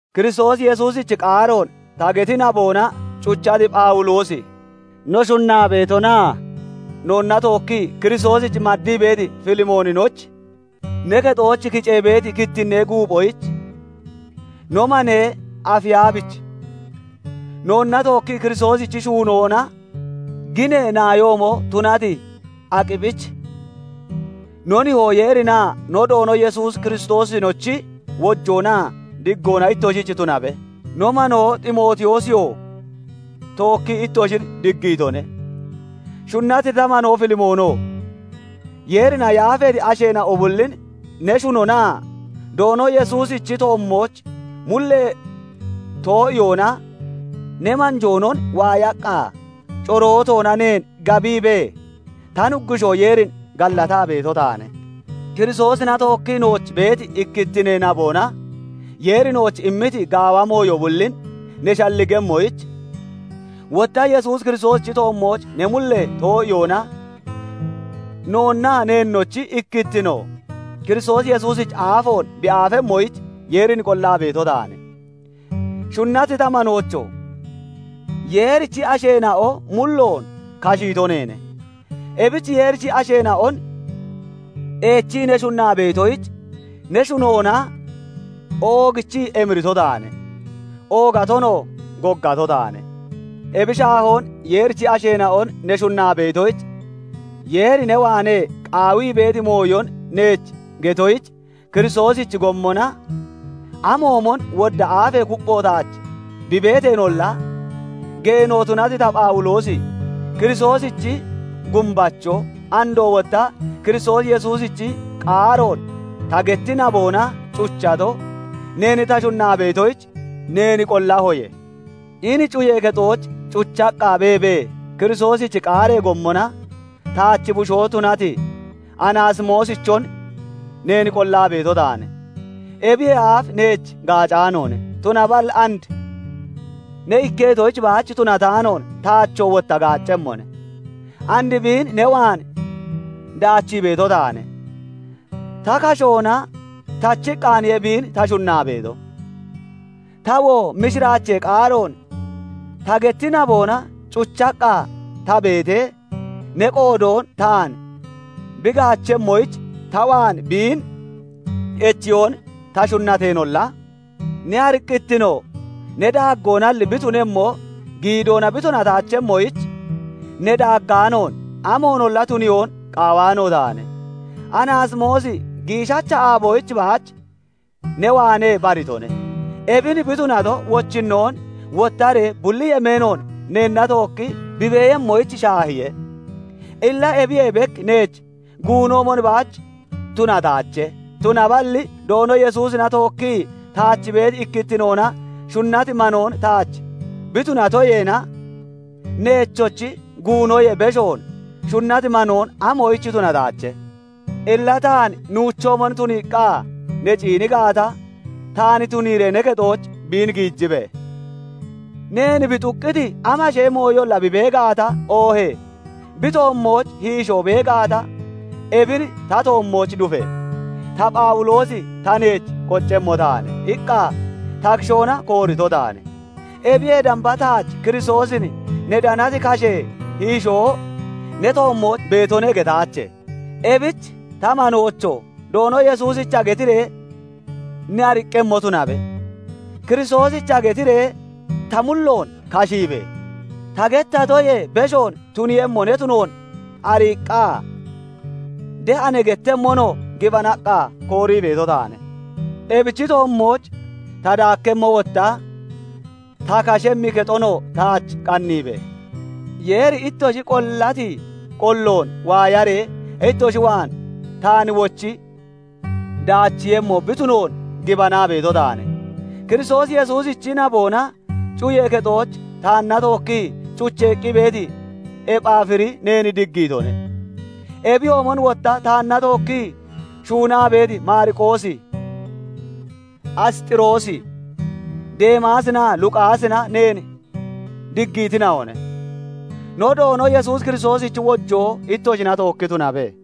Kiristoos Yesuusichi qaaroon ta geti naboona cuchati Phawuloosi, no shunnaa beetonaa noonna tookkii Kiristoosich maddii beeti Filimoonich, ne kexooch kicee beeti kittinnee guuphoyich, no manee Afiyabich, noonna tookkii Kiristoosichi shuunoona ginee naayoomo tunati Akiphich, no Nihoo Yeerinaa no Doono Yesuus Kiristoosinochi wojoonaa diggoona ittoshich tunabe. No manoo Ximootiyoosiyoo tookkii ittoshin diggiitone. Shunnati ta manoo Filimoono! Yeerina yaafeeti asheena'o bullin ne shunonaa Doono Yesuusichi toommooch mullee too'iyoona ne manjoonon waayaqqa corootoona neen gabiibee ta Nuggushoo Yeerin gallataa beeto taane. Kiristoosina tookkii nooch beeti ikkittinee naboona Yeeri nooch immiti gaawa mooyo bullin ne shalligemmoyich, wotta Yesuus Kiristoosichi toommooch ne mullee too'iyoona, noonnaa neennochi ikkittino Kiristoos Yesuusich aafoon bi aafemmoyich Yeerin qollaa beeto taane. Shunnati ta manoocho! Yeerichi asheena'o mulloon kashiito neene. Ebich Yeerichi asheena'on eechii ne shunnaa beetoyich ne shunoona oogichii emirito taane; oogatonoo goggato taane. Ebi shaahoon Yeerichi asheena'on ne shunnaa beetoyich, Yeeri ne waanee qaawii beeti mooyon neech getoyich Kiristoosichi gommona amoomon wodda aafee kuppho taach bi beeteenolla, geeno tunati ta Phawuloosi Kiristoosichi gumbacho, andoo wotta Kiristoos Yesuusichi qaaroon ta getti naboona cuchato, neen ta shunnaa beetoyich neen qollahoye. Hini cuyee kexooch cuchaqqa beebee, Kiristoosichi qaaree gommona taach bushoo tunati Anaasimoosichon neen qollaa beeto taane. Ebiyee aaf neech gaacaanoone; tunaballi and ne ikketoyich baach tunataanoon, taachoo wotta gaaccemmone. And biin ne waan daachii beeto taane. Ta kashoona tachiqqaaniye biin ta shunnaa beeto. Tawoo mishiraachee qaaroon ta geti naboona cuchaqqa ta beetee, ne qoodoon taan bi gaachemmoyich ta waan biin echiyoon ta shunnateenolla, ne ariqqittino ne daaggoonalli bi tunemmo, giidoona bi tunataachemmoyich ne daaggaanoon amoonolla tuniyoon qaawaano taane. Anaasimoosi giishacha aaboyich baach ne waanee baritone. Ebin bi tunato, wochinnoon wottaree bulli yemeenoon neenna tookki bi beeyemmoyich shaahiye. Illa ebiyee bek neech guunoomon baach tunataache; tunaballi Doono Yesuusina tookkii taach beeti ikkittinoona shunnati manoon taach bi tunatoyeena, neechochi guunoyee beshoon shunnati manoon amoyich tunataache? Illa taan nuuchoomon tuniiqqa ne ciini gaata, taan tuniiree ne kexooch biin giijibe! Neen bi xuqqiti amashee mooyolla bi bee gaata, oohee bi toommooch hiishoo bee gaata, ebin ta toommooch dufe! "Ta Phawuloosi, ta neech qoccemmo taane" iqqa ta kishoona koorito taane; ebiyee damba taach Kiristoosin ne danati kashee hiishoo ne toommooch beetone getaache. Ebich ta manoocho! Doono Yesuusicha getiree ne ariqqemmo tunabe. Kiristoosicha getiree ta mulloon kashiibe! Ta gettatoyee beshoon tuniiyemmo ne tunoon ariiqqa de'a ne gettemmonoo gibanaqqa koorii beeto taane. Ebichi toommooch ta daakkemmo wotta ta kashemmi kexonoo taach qanniibe! Yeeri ittoshi qollati qolloon waayaree ittoshi waan taan wochi daachiiyemmo bi tunoon gibanaa beeto taane. Kiristoos Yesuusichi naboona cuyee kexooch taanna tookkii cucheeqqi beeti Ephaafiri neen diggiitone. Ebiyoomon wotta taanna tookkii shuunnaa beeti Maariqoosi, Asxiroosi, Deemaasinaa Luqaasina neen diggiitina'one. No Doono Yesuus Kiristoosichi wojoo ittoshina tookki tunabe.